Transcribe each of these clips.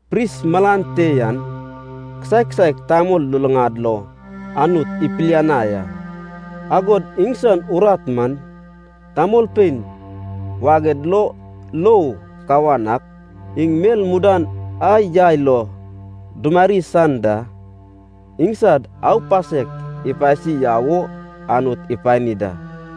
Pris malan te yan kisaek kisaek tamol luluŋad lo Anut ipiliani a. Agod iŋsan urat man, tamolpein waged lo lou kawan ak iŋ mel mudan a yai lo dumari san da, iŋsad aupasek ipasi yau wo Anut ipani da.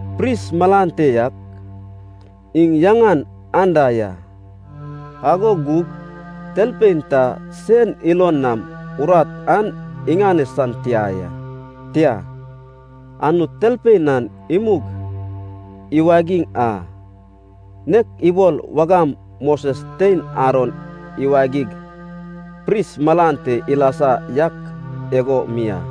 Pris malan te yak iŋ yaŋan anda ya, ago gug talpein ta sen ilon nam urat an iŋane san tia ya. Tia, Anut talpein an imug iwagiŋ a, nek ibol wagam Moses tein Aron iwagig pris malan te ilasa yak igo mi a.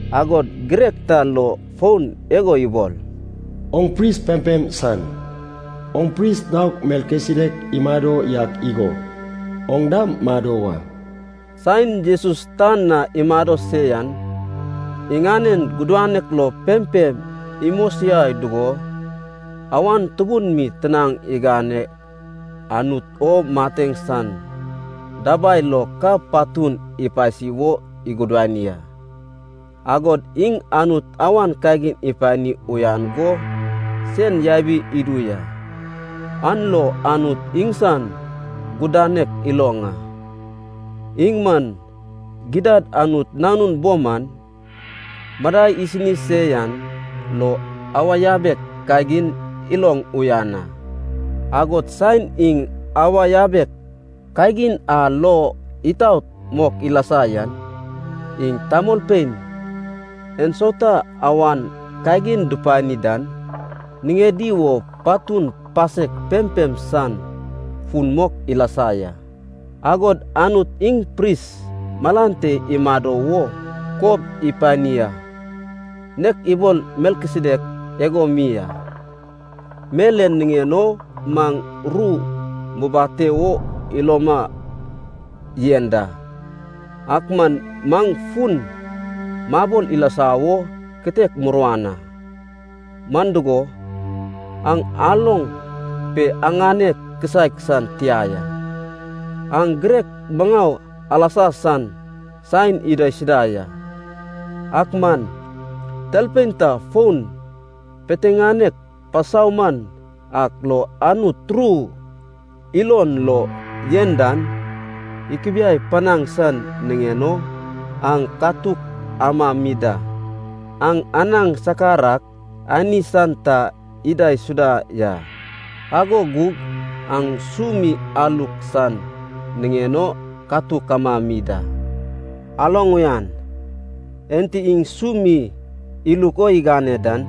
Agod girek ta lo fon igo ibol, “Oŋ pris pempem san, oŋ pris naok Melkisedek imado yak igo, oŋ dam mado wa.” Saen Jesus tan na imado se yan, iŋanen gudanek lo pempem imosiai dugo, awan tubun mi tinaŋ iganeg Anut o mateŋ san dabai lo ka patun ipasi wo igudani a. Agod iŋ Anut awan kagin ipani uyan go sen yabi idu ya, an lo Anut iŋsan gudanek iloŋ a. Iŋ man gidad Anut Nanun bo man, madai isini se yan lo awa yabek kagin iloŋ uyan a. Agod saen iŋ awa yabek kagin a lo itaot mok ilasa yan, iŋ tamolpein ensauta awan kagin dupani dan niŋedi wo patun pasek pempem san fun mok ilasa ya. Agod Anut iŋ pris malan te imado wo kob ipani a, nek ibol Melkisedek igo mi a. Mel en niŋen o maŋ ru mubate wo iloma yen da, ak man maŋ fun mabol ilasa wo kitek muruan a. Man dugo, aŋ aloŋ pe aŋane kisaek san tia ya. Aŋ girek maŋau alasa san saen idaisuda ya. Ak man talpein ta fon piteŋanek pasauman ak lo Anut ru ilon lo yen dan ikubiai panaŋ san niŋen o aŋ katuk amami da. Aŋ anaŋ sakar ak ani san ta idaisuda ya, ago gug aŋ su mi aluk san niŋen o katuk amami da. Aloŋ uyan, enti iŋ su mi iluk o igane dan,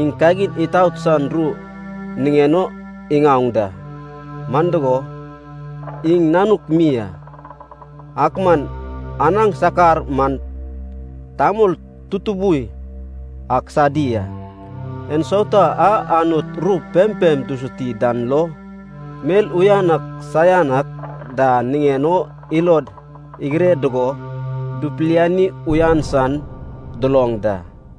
iŋ kagin itaot san ru niŋen o iŋaoŋ da, man dugo, iŋ nanuk mi a. Ak man anaŋ sakar man tamol tutubui ak sadi a, en sauta a Anut ru pempem dusuti dan lo, mel uyan ak saian ak da niŋen o ilod igire dugo dupiliani uyan san duloŋ da.